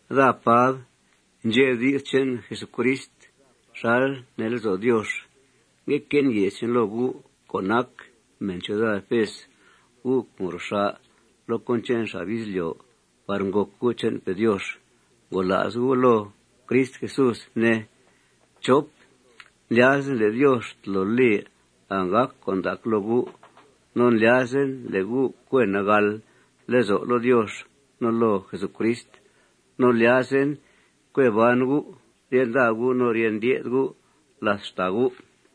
Daa, Pab, ndxe' di's che'n Jesucrist xal nee lezo' Diox. Ngue que'en ye's loo gu' co' nac mèn ciuda Efes, gu' co' ngro xà' loo cón che'n xab izlyo' par ngòc gu' che'npe' Diox. Ngola's gu' loo Crist Jesús, ne. Ndlyazen le' Diox tolo li anggàc con' ndac loo gu'. No ndlyazen le' gu' cue nagàl lezo' loo Diox no loo Jesucrist. No ndlyazen cue ban gu' rye nda gu' no rye ndye'th gu' làth xtàa gu'.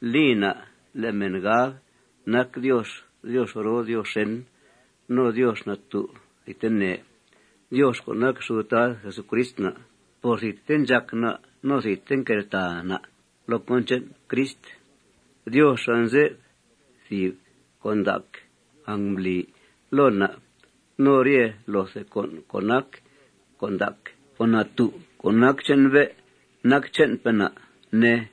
Li na' le' mèn gab nac Diox Diox roo no Diox xèn no Diox natú' thidtene, Diox co' nac xud Tad Jesucrist na'. Por thidte ndxàc na' no thidte nqueltàa na' loo cón che'n Crist, Diox anze'f thìb con' ndac angmbli loo na' no rye loothe con' co' nac con' ndac. Con' natú' co' nac che'n bé' nac che'npe' na', ne.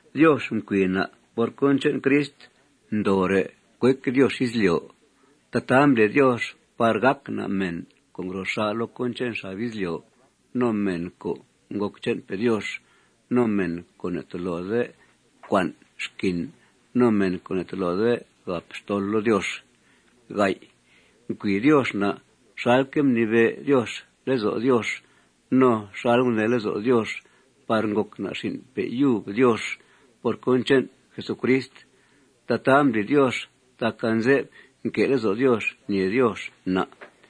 Diox mcui na' por cón che'n Crist ndoore' cuec Diox izlyo'. Tataa mbli Diox par gàc na' mèn co' ngro xà' loo cón che'n xab izlyo', no mèn co' ngòc che'npe' Diox, no mèn co' ne'tolode cua'n xquin, no mèn co' ne'tolode gàp xtol loo Diox. Mcui Diox na' xalque' mnibe' Diox lezo' Diox no xal gunee lezo' Diox par ngòc na' xin'pe' yub Diox por cón che'n Jesucrist. Tataa mbli Diox tac anze'f nque' lezo' Diox ñèe Diox na'.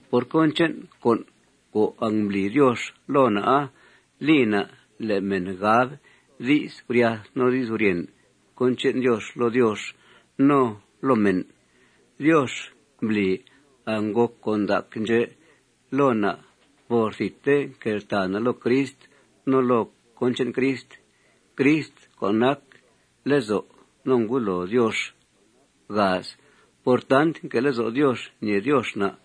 Por cón che'n con' co' angmbli Diox loo na'a, li na' le' mèn gab di's guryath no di's guryèn cón che'n Diox loo Diox no loo mèn. Diox mbli angngòc con' ndac ndxè' loo na' por thidte nqueltàa na' loo Crist no loo cón che'n Crist, Crist co' nac lezo' no ngudloo Diox. Por tant nque' lezo' Diox ñèe Diox na',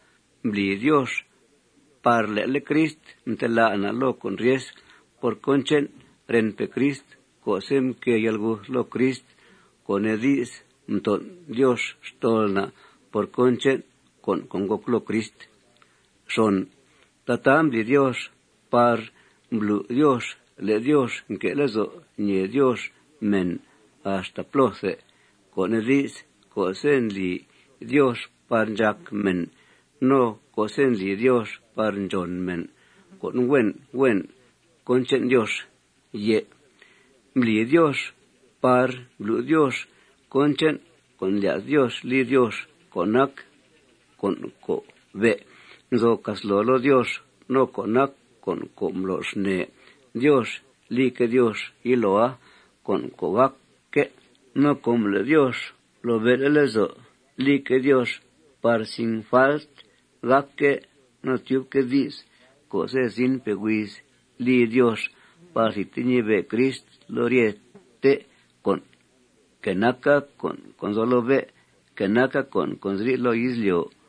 mbli Diox par le'le' Crist mtelá' na' loo con' ryes por cón che'n renpe' Crist co'se' mquée yalguth loo Crist, co' nee di's, mton' Diox xtol na' por cón che'n con' co' ngòc loo Crist. Tataa mbli Diox par mblu' Diox le' Diox nque' lezo' ñèe Diox mèn axta plóthe, co' nee di's, co'se' ndli Diox par ndxác mèn no co'se' ndli Diox ndxòn mèn co' huen huen cón che'n Diox. No mbli Diox par mblu' Diox cón che'n con' ndlya's Diox li Diox co' nac con' co' be' nzo casloo loo Diox no co' nac co' mblo xnee Diox lique' Diox yiloa, con' co' gàcque'. No com le' Diox mblobe'le' lezo' lique' Diox par sin falt gàcque' no tyubque' di's co'se' zinpe' huiz li Diox par thidte ñibe' Crist loo ryete con', que naca con' co' nzo loo bé', que naca con' co' nziri' loo izlyo'.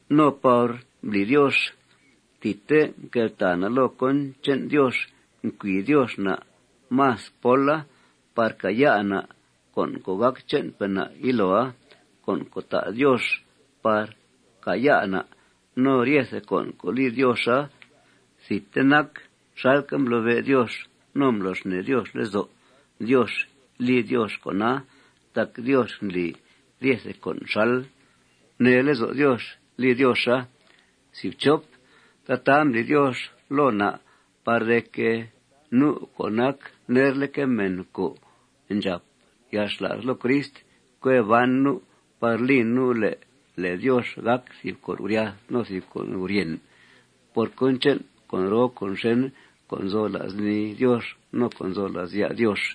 No par mbli Diox thidte mqueltàa na' loo cón che'n Diox, mcui Diox na' más póla par càaya' na' con' co' gàc che'npe' na' yiloa, con' co' ta' Diox par càaya' na'. No ryete con' co' li Dioxa thidte nac xalque' mblobe' Diox no mblo xnee Diox lezo' Diox li Diox con'a tac Diox ndli ryete con' xal gunee lezo' Diox li Dioxa. Tataa mbli Diox loo na' par de que, nu' co' nac nerleque' mèn co' ndxàp yalxla's loo Crist, cue ban nu' par li nu' le' lèe Diox gàc thìb con' guryath no thìb con' guryèn por cón che'n con' roo con' xèn co' nzo la's nii Diox no co' nzo la's ya' Diox.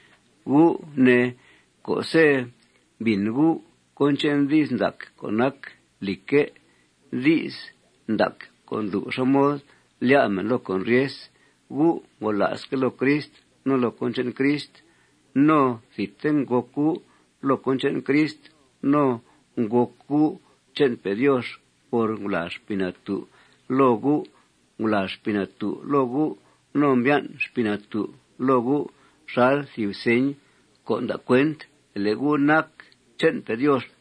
Gu' ne, co'se' mbìn gu' cón che'n di's ndac co' nac lìcque', di's ndac co' ndlu' xá mod lyá' mèn loo con' ryes, gu' ngola'sque' loo Crist no loo cón che'n Crist. No thidte ngòc gu' loo cón che'n Crist no ngòc gu' che'npe' Diox por ngulàa Xpii Natú' loo gu'. Ngulàa Xpii Natú' loo gu' no mbyan' Xpii Natú' loo gu' xal thìb señ co' nda' cuent le' gu' nac che'npe' Diox.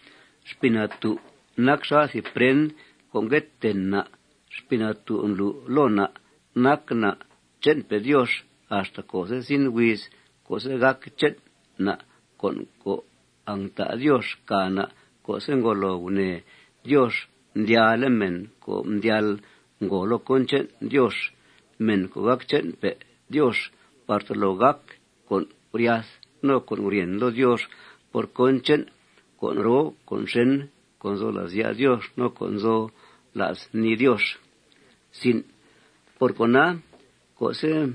Xpii Natú' nac xal thìb prend co' ngue ten na'. Xpii Natú' ndlu' loo na' nac na' che'npe' Diox axta co'se' zin huiz co'se' gàc che'n na' con' co' angta' Diox càa na' co'se' ngolo gunèe Diox mdyalle' mèn co' mdyal ngòo loo cón che'n Diox, mèn co' gàc che'npe' Diox, par tolo gàc con' guryath no con' guryèn loo Diox por cón che'n con' roo con' xèn co' nzo la's ya' Diox no co' nzo la's nii Diox. Por cona, co'se'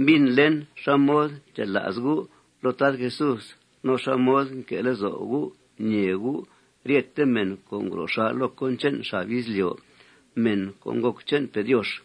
mbìnlen xá mod ndxela's gu' loo Tad Jesús no xá mod nque' lezo' gu' ñèe gu' ryete mèn co' ngro xà' loo cón che'n xab izlyo', mèn co' ngòc che'npe' Diox,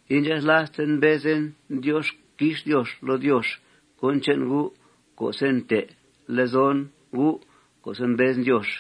indxathlasten mbezen Diox quix Diox loo Diox cón che'n gu' co'se' nte' lezon gu' co'se' mbezen Diox.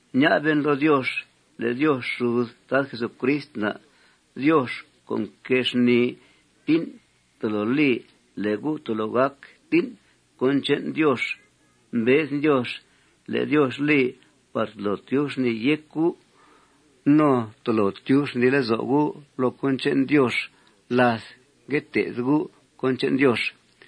Ña'ben loo Diox le' Diox xud Tad Jesucrist na', Diox co' nquée xnìi tín', tolo li le' gu' tolo gác tín' cón che'n Diox. Mbezen Diox le' Diox li par tolo tyub xnìi yéc gu' no par tolo tyub xnìi lezo' gu' loo cón che'n Diox láth ngue té'th gu' cón che'n Diox.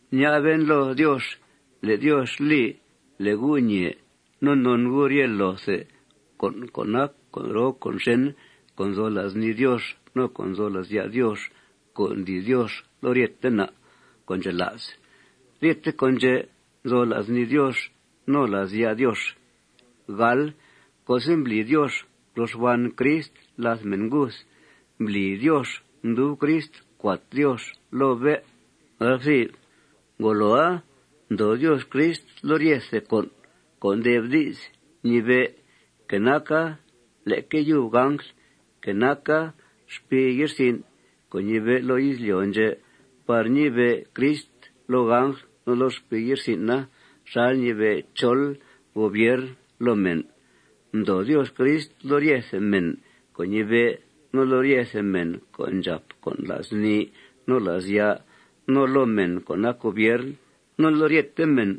Ña'ben loo Diox le' Diox li le' gu' ñee no non gu' rye loothe con' co' nac con' roo con' xèn co' nzo la's nii Diox no co' nzo la's ya' Diox co' ndli Diox loo ryete na' co' ndxela's. Ryete con' ndxè' nzo la's nii Diox no la's ya' Diox. Co'se' mbli Diox ngro xban Crist làth mèn nguth, mbli Diox mdub Crist cuat Diox loo bé'. Ngoloa, mdoo Diox Crist loo ryethe co' nde'f di's ñibe', que naca leque yub angl, que naca xpii ye'rsin' co' ñibe' loo izlyo' ndxè', par ñibe' Crist loo angl no loo xpii ye'rsin'a xal ñibe' chol gobiern loo mèn. Mdoo Diox Crist loo ryete mèn co' ñibe', no loo ryete mèn co' ndxàp con' la's nii no la's ya', no loo mèn co' nac gobiern, no loo ryete mèn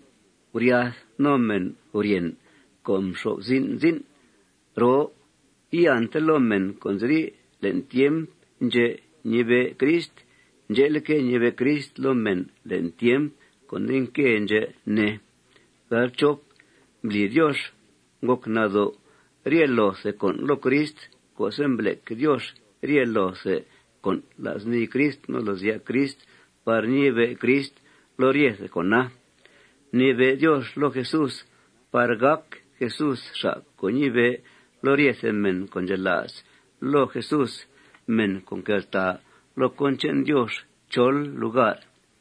guryath no mèn guryèn co' nxo'f zin' zin' roo. Iante loo mèn co' nziri' le'n tiemp ndxè' ñibe' Crist. Ndxe'leque', ñibe' Crist loo mèn le'n tiemp co' nde nque ndxè', ne. Mbli Diox ngòc nado' rye loothe con' loo Crist co'se' mblec Diox rye loothe con' la's nii Crist no la's ya' Crist par ñibe' Crist loo ryethe con'a. Mnibe' Diox loo Jesús par gàc Jesús xa' co' ñibe' loo ryethe mèn co' ndxela's loo Jesús, mèn co' nqueltàa loo cón che'n Diox chol lugar.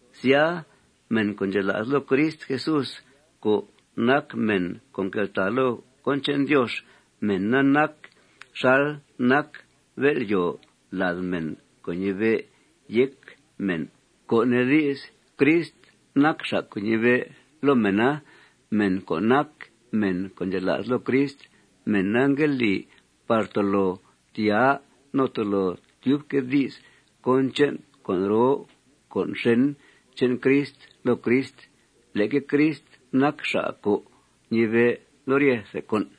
Sya, mèn co' ndxela's loo Crist Jesús co' nac mèn co' nqueltàa loo cón che'n Diox, mèna nac xal nac bél'yòo lad mèn co' ñibe' yéc mèn, co' nee di's, Crist nac xa' co' ñibe' loo mèna. Mèn co' nac mèn co' ndxela's loo Crist, mèna ngue li par tolo tyaa no tolo tyubque' di's cón che'n con' roo con' xèn che'n Crist loo Crist. Leque Crist nac xa' co' ñibe' loo ryethe con'.